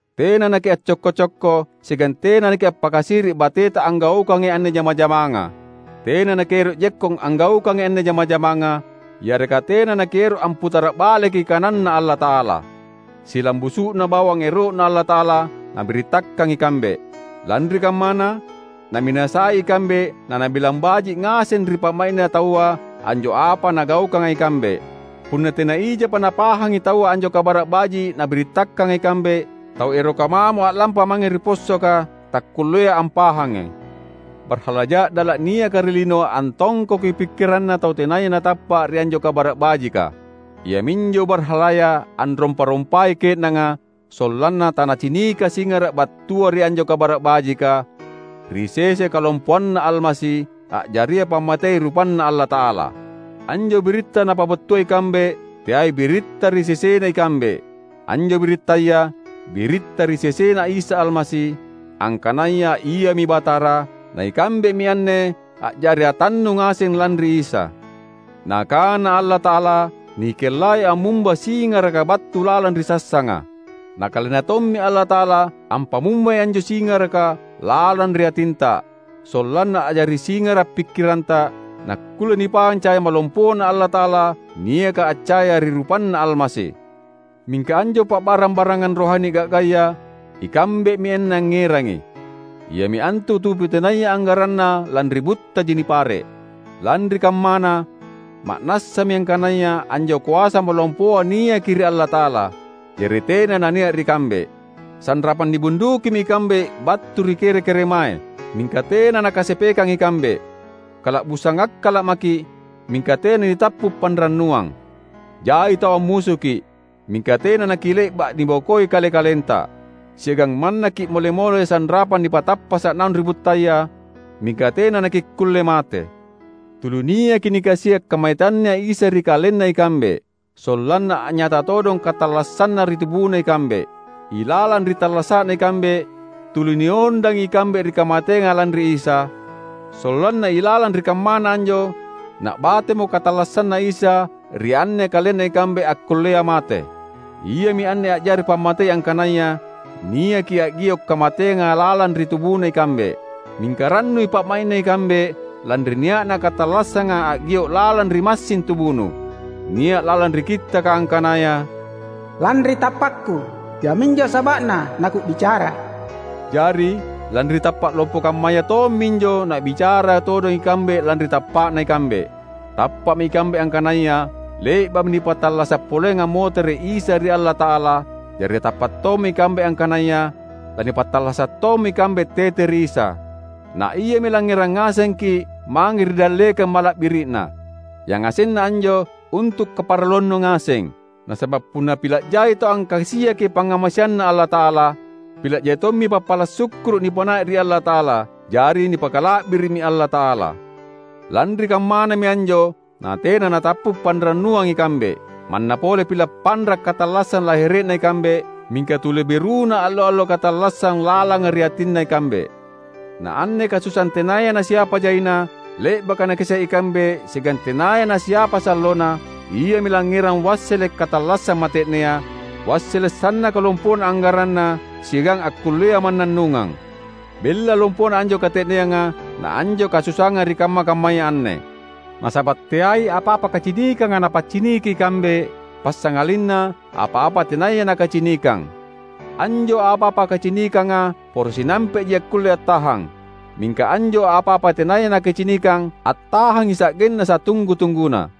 Tena nakiaccokko-cokko siagang tena nakiappakasiri’ bateta anggaukangi anne jama-jamanga. Tena nakiero’ jekkong anggaukangi anne jama-jamanga, yareka tena nakiero’ amputara’ baleki kananNa Allata’ala. Silambusu’na bawang ero’Na Allata’ala nabirittakang ikambe. Lanri kammana, naminasai ikambe nanabilang baji’ ngaseng ri pa’mai’na taua anjo apa nagaukanga ikambe. Punna tena ijapa napahangi taua anjo Kabara’ Baji’ nabirittakanga ikambe, tau eroka mamo a’lampa mange ri possoka takkullea ampahangi. Barhala ja’dala’ niaka ri lino antongkoki pikkiranna tau tenaya natappa’ ri anjo Kabara’ Bajika. Iaminjo barhalaya anrompa-rompai ke’nanga sollanna tanacinika singara’ battua ri anjo Kabara’ Bajika, ri sese kalompoanNa Almasi, a’jaria pammatei rupanNa Allata’ala. Anjo biritta napabattua ikambe teai biritta ri sesena ikambe. Anjo birittaya, biritta ri sesena Isa Almasi, angkanaya Iami Batara; na ikambemi anne a’jari atannu ngaseng lanri Isa. Nakana Allata’ala, "Nikellai ammumba singaraka battu lalang ri sassanga," na KalenNa tommi Allata’ala ampamumbai anjo singaraka lalang ri atinta, sollanna a’jari singara’ pikkiranta, nakkulle nipahang caya malompoNa Allata’ala niaka accaya ri rupanNa Almasi. Mingka anjo pa’barang-barangang rohani ga’gaya, ikambemi anne angngerangi, iami antu tubu tenaya anggaranna lanri buttaji nipare’. Lanri kammana, ma’nassami angkanaya anjo koasa malompoa niaki ri Allata’ala, jari tena nania’ ri kambe. Sanrapang nibundukimi ikambe battu ri kere-keremae, mingka tena nakasepekang ikambe. Kala’busang akkala’ maki’, mingka tena nitappu’ panrannuang. Jai tau ammusuki’, mingka tena nakile’ba’ nibokoi kale-kalenta. Siagang manna ki’mole-mole sanrapang nipatappasa’ naung ri buttaya, mingka tena nakikkulle mate. Tuli niaki nikasia’ kamateanNa Isa ri kalenna ikambe. Sollanna a’nyata todong katallassanNa ri tubuna ikambe. Ilalang ri tallasa’na ikambe, tuli niondangi ikambe ri kamateanga lanri Isa, sollanna ilalang ri kammana anjo na’batemo katallassanNa Isa ri anne kalenna ikambe akkullea mate. Iami anne a’jari pammatei angkanaya niaki a’gio’ kamateanga lalang ri tubuna ikambe; mingka rannui pa’mai’na ikambe lanri nia’na katallassanga a’gio’ lalang ri massing tubunu. Nia’ lalang ri Kittaka angkanaya, "Lanri tappakku, iaminjo saba’na naku’bicara." Jari, lanri tappa’ lompo kammaya tomminjo na’bicara todong ikambe lanri tappa’na ikambe. Tappa’mi ikambe angkanaya le’ba’mi nipattallasa’ poleang ammotere’ Isa ri Allata’ala; jari tappa’ tommi ikambe angkanaya lanipattallasa’ tommi ikambe tete ri Isa. Na Iami langngerang ngasengki’ mange ri dallekang mala’biri’Na. Yangasenna anjo, untu’ kaparalluannu ngaseng. Nasaba’ punna pila’ jai tau angkasiaki pangngamaseanNa Allata’ala, pila’ jai tommi pappala’ sukkuru’ nipanai’ ri Allata’ala; jari nipakala’biri’mi Allata’ala. Lanri kammanami anjo natena natappu’ panrannuang ikambe. Manna pole pila’ panra’ katallassang lahere’na ikambe, mingka tuli beruna allo-allo katallassang lalanga ri atinna ikambe. Na anne kasusaang tenaya nasiapa jaina, le’baka nakasia’ ikambe siagang tenaya nasiapa sallona, iami langngerang wassele’ katallassang mate’nea, wassele’ sannaka lompona anggaranna siagang akkullea mannannungang. Bella lompona anjo kate’neanga na anjo kasusaanga ri kamma-kammaya anne. Nasaba’ teai apa-apa kacinikanga napacciniki ikambe, passangalinna apa-apa tenaya nakacinikang. Anjo apa-apa kacinikanga poro sinampe’ji akkulle attahang; mingka anjo apa-apa tenaya nakacinikang attahangi sa’genna satunggu-tungguna.